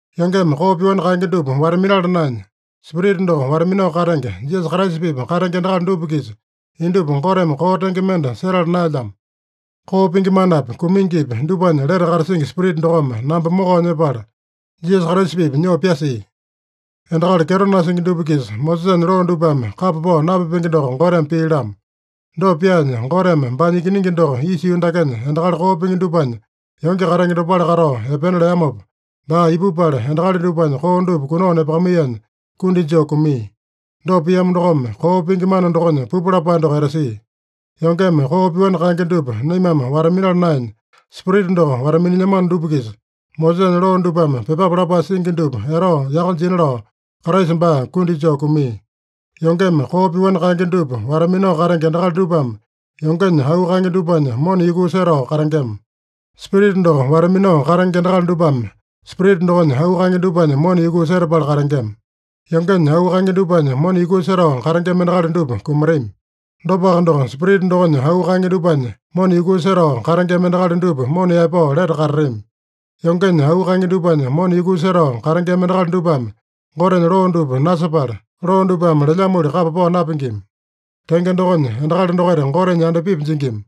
Yongeme koo pyoani kaenge dupa wata-minala naenya, Spirita doko wata-minao katenge, Jisasa Kraisa-pipa katenge endakali dupa-kisa indupa Goteme koo tenge mende setala naelyamo. Koo pingi manapi, kumingipi dupanya lete katasingi Spirita dokome namba mokao nyepala, Jisasa Kraisa-pipa nyoo pyasia. Endakali kyeto nasingi dupa-kisa Mosesanya loo dupame kapa pao napipenge doko Goteme pia-lamo. Dopa pyaanya, Goteme baanya Ikiningi doko isa yuu dakenya endakali koo pingi dupanya yonge katenge dopale katao epena leamopa, baa ipupala endakali dupanya koo dupa kunao nepakamaiyanya kundi joo kumia. Dopa piamo dokome, koo pingi mana dokonya pupu lapae doko etasia. Yongeme koo pyoani kaenge dupa naimame wata-minala naenya, Spirita doko wata-minilyamano dupa-kisa, Mosesanya loo dupame pyepape lapae singi dupa etao yaka jina lao Kraisa baa kundi joo kumia. Yongeme koo pyoani kaenge dupa wata-minao katenge endakali dupame yongenya auu kaenge dupanya mona yukuu setao katengema. Spirita doko wata-minao katenge endakali dupame Spirita dokonya auu kaenge dupanya mona yukuu setapala katengema. Yongenya auu kaenge dupanya mona yukuu setao katengema endakali dupa kumatami. Dopaka doko, Spirita dokonya auu kaenge dupanya mona yukuu setao katengema endakali dupa mona yaepao lete katatami. Yongenya auu kaenge dupanya mona yukuu setao katengema endakali dupame Gotenya loo dupa nasepala, loo dupame lelyamoli kapa pao napingima. Tenge dokonya, endakali dokaita Gotenya yandapipi jingima.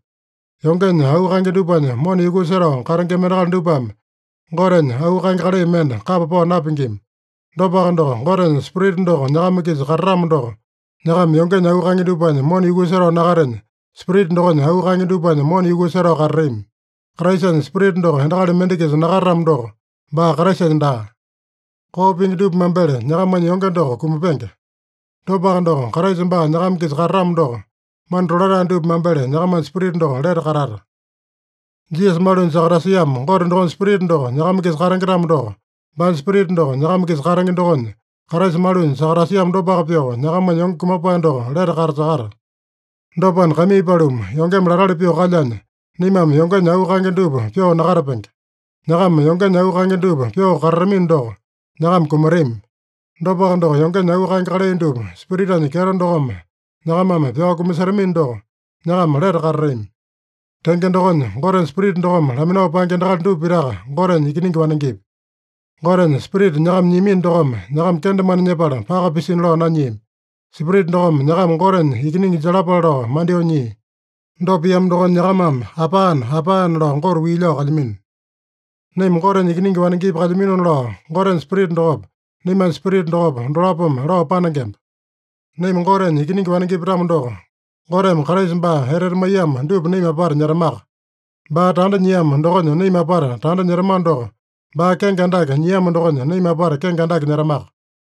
Yongenya auu kaenge dupanya mona yukuu setao katengema endakali dupame Gotenya auu kaenge kalai mende kapa pao napingima. Dopaka doko, Gotenya Spirita doko nyakama-kisa katatamo doko, nyakama yongenya auu kaenge dupanya mona yukuu setao nakatenya, Spirita dokonya auu kaenge dupanya mona yukuu setao katatami. Kraisanya Spirita doko endakali mende-kisa nakatatamo doko, baa Kraisanya daa. Koo pingi dupa mambele nyakamanya yonge doko kumapenge. Dopaka doko, Kraisa baa nyakama-kisa katatamo doko, mana tolatae dupa mambele nyakamanya spirita doko lete katata. Jisasa malunya sakatasiamo Gote dokonya Spirita doko nyakama-kisa katenge-tamo doko, baanya Spirita doko nyakama-kisa katenge dokonya, Kraisa malunya sakatasiamo dopaka pyoo, nyakamanya yonge kumapae doko lete katasakata. Dopana, kaimii paluma, yongeme latali pyoo kalyanya, naimame yongenya auu kaenge dupa pyoo nakatapenge. Nyakama yongenya auu kaenge dupa pyoo katatamino doko, nyakama kumatami. Dopaka doko, yongenya auu kaenge kalai dupa Spiritanya kyeto dokome nyakamame pyao kumasetamino doko, nyakama lete katatami. Tenge dokonya, Gotenya Spirita dokome laminao paenge endakali dupa pitaka Gotenya ikiningi wanengepi. Gotenya Spirita nyakama nyiamino dokome nyakama kendemane nyepala paka pisina lao nanyiami. Spirita dokome nyakama Gotenya ikiningi jalapale lao mandyoo nyia. Dopa piamo dokonya nyakamame “Apane! Apane!” lao Gote wii lao kalyamino. Naima Gotenya ikiningi wanengepi kalyaminona lao, Gotenya Spirita dokopa, naimanya spirita dokopa, dolapome lao panengemba. Naima Gotenya ikiningi wanengepi-tamo doko, Goteme Kraisa baa etete maiyamo dupa naima apata nyetamaka. Baa tanda nyiamo dokonya naima apata tanda nyetamano doko, baa kenge andake nyiamo dokonya, naima apata kenge andake nyetamaka.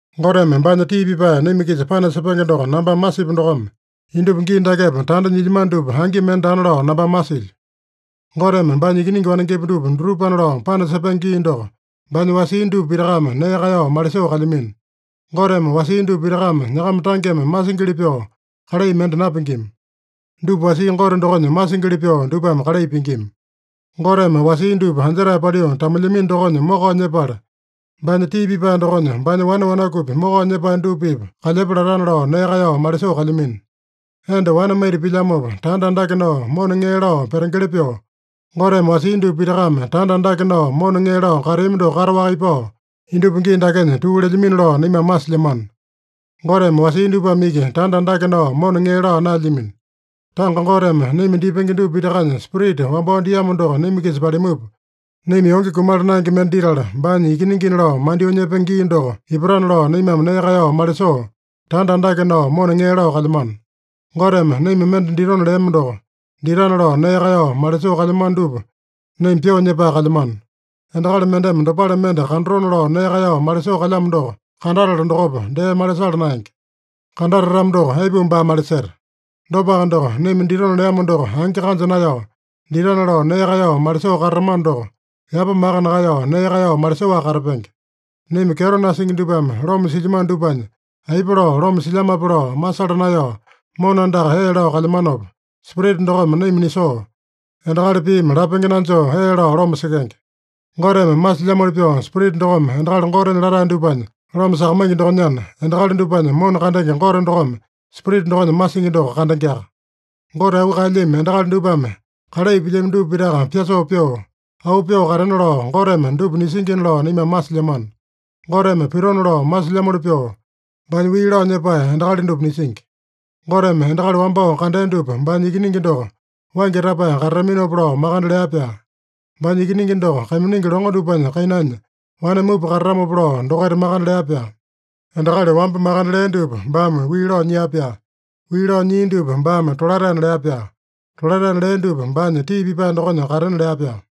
Goteme baanya tii pipae naima-kisa panasepenge doko nambame masipu dokome, indupa gii dakepa tanda nyilyamano dupa angi mende daana lao nambame masilyo. Goteme baanya ikiningi wanengepi dupa dutupana lao panasepenge gii doko baanya wasia dupa pitakame nee kaeyao malisoo kalyamino. Goteme wasia dupa pitakame nyakama tangeme masingili pyoo kalai mende napingima. Dupa wasia Gote dokonya masingili pyoo dupame kalai pingima. Goteme wasia dupa anjetae paliu tamulyamino dokonya mokao nyepala, baanya tii pipae dokonya baanya wane wanakupi mokao nyepae dupa-pipa kalyepa latana lao nee kaeyao malisoo kalyamino. Enda wane maita pilyamopa tanda andake nao mona ŋee lao petengeli pyoo, Goteme wasia dupa pitakame tanda andake nao mona ŋee lao kateami doko kataowaka ipao, indupa gii dakenya tuu lelyamino lao naimame masilyamano. Goteme wasia dupame iki tanda andake nao mona ŋee laa naelyamino. Tanga Goteme naima dipenge dupa pitakanya Spirita wambao diamo doko naima-kisa palimupa, naima yonge kumala naenge mende ditala, baanya ikiningina lao mandyoo nyepenge gii doko ipatana lao naimame nee kaeyao malisoo, tanda andake nao mona ŋee lao kalyamano. Goteme naima mende ditona leamo doko ditana lao nee kaeyao malisoo kalyamano dupa naima pyoo nyepae kalyamano. Endakali mendeme dopale mende kandatona lao nee kaeyao malisoo kalyamo doko kandatala dokopa, dee malisala naenge. Kandatatamo doko, aipuma baa maliseta? Dopaka doko, naima ditona leamo doko angi kanja naeyao, ditana lao nee kaeyao malisoo katatamano doko, yapa maka nakaeyao nee kaeyao malisoaka katapenge. Naima kyeto nasingi dupame loma silyamano dupanya aipa lao loma silyamape lao masala naeyao mona andaka ee lao kalyamanopa, Spirita dokome naima nisoo, endakali piimi lapenge nanjoo ee lao loma sekenge. Goteme masilyamoli pyoo Spirita dokome endakali Gotenya latae dupanya loma sakamaingi dokonyana, endakali dupanya mona kandenge Gote dokome Spirita dokonya masingi doko kandengeaka. Gote auu kaelyami endakali dupame kalai pilyami dupa pitaka pyasoo pyoo, auu pyoo katena lao Goteme dupa nisingina lao naimame masilyamano. Goteme pitona lao masilyamoli pyoo, baanya wii lao nyepae endakali dupa nisingi. Goteme endakali wambao kandea dupa baanya Ikiningi doko waingi tapae katataminopa lao makande lea-pyaa. Baanya Ikiningi doko kaiminingi longo dupanya kainanya wane mupa katatamopa lao dokaita makande lea-pyaa. Endakali wamba makande lea dupa baame wii lao nyia-pyaa. Wii lao nyia dupa baame tolataena lea-pyaa. Tolataena lea dupa baanya tii pipae dokonya katena lea-pyaa.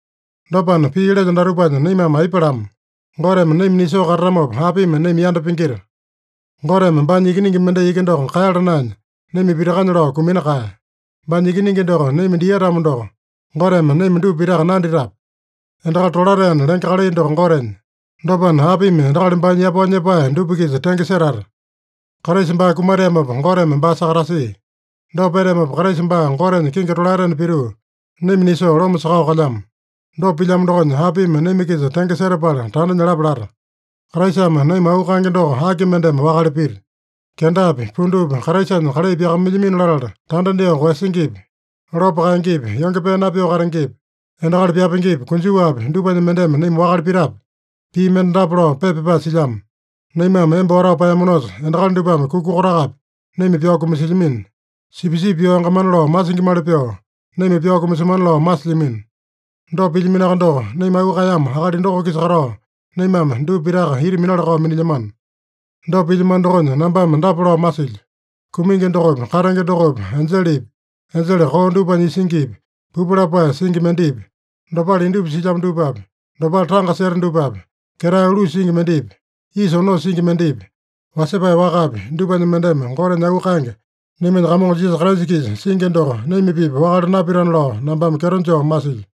Dopana, pii lelyo datupanya naimame aipa lama? Goteme naima nisoo katatamopa, apimi naima yanda pingita? Goteme baanya Ikiningi mendai iki doko kaeyala naenya, naima pitakanya lao kumina kaeya. Baanya Ikiningi doko naima dia-tamo doko, Goteme naima dupa pitaka nanditape? Endakali tolataena lenge kalai doko Gotenya. Dopana, apimi endakali baanya yapao nyepae dupa-kisa tenge setata? Kraisa baa kumateamopa Goteme baa sakatasia. Dopa peteamopa, Kraisa baa Gotenya kingi tolaetena pituu, naima nisoo loma sakao kalyamo. Dopa pilyamo dokonya, apimi naima-kisa tenge setapala tanda nyalapa lata? Kraisame naima auu kaenge doko aki mendeme wakale pita? Kendapi, pundupi, Kraisanya kalai pyakamailyamino latala tanda dyoo koeyasingipi, lopo kaengepi, yonge pee napyoo katengepi, endakali pyapengepi, konjuwapi, dupanya mendeme naima wakale pitape? Pii mende dapa lao pepa pyapae silyamo: “Naimame emba watao paeyamanosa, endakali dupame kuka kotakapi naima pyao kumasilyamino. Sipisipi pyao yangamana lao masingimali pyoo, naima pyao kumasemana lao masilyamino.” Dopa pilyaminoaka doko, naima auu kaeyamo akali doko-kisa katao, naimame dupa pitaka ita minala-kao minilyamano. Dopa pilyamano dokonya nambame dapa lao masilyo: Kumingi dokopi, katenge dokopi, enjelepi, enjele koo dupanya isingipi, pupu lapae singi mendepi, dopale indupa silyamo dupapi, dopale tanga seta dupapi, ketae ulusa singi mendepi, isa onosa singi mendepi, wasepae wakapi, dupanya mendeme Gotenya auu kaenge, naimanya Kamongo Jisasa Kraisa-kisa singi doko naima-pipa wakale napitana lao nambame kyeto joo masilyo.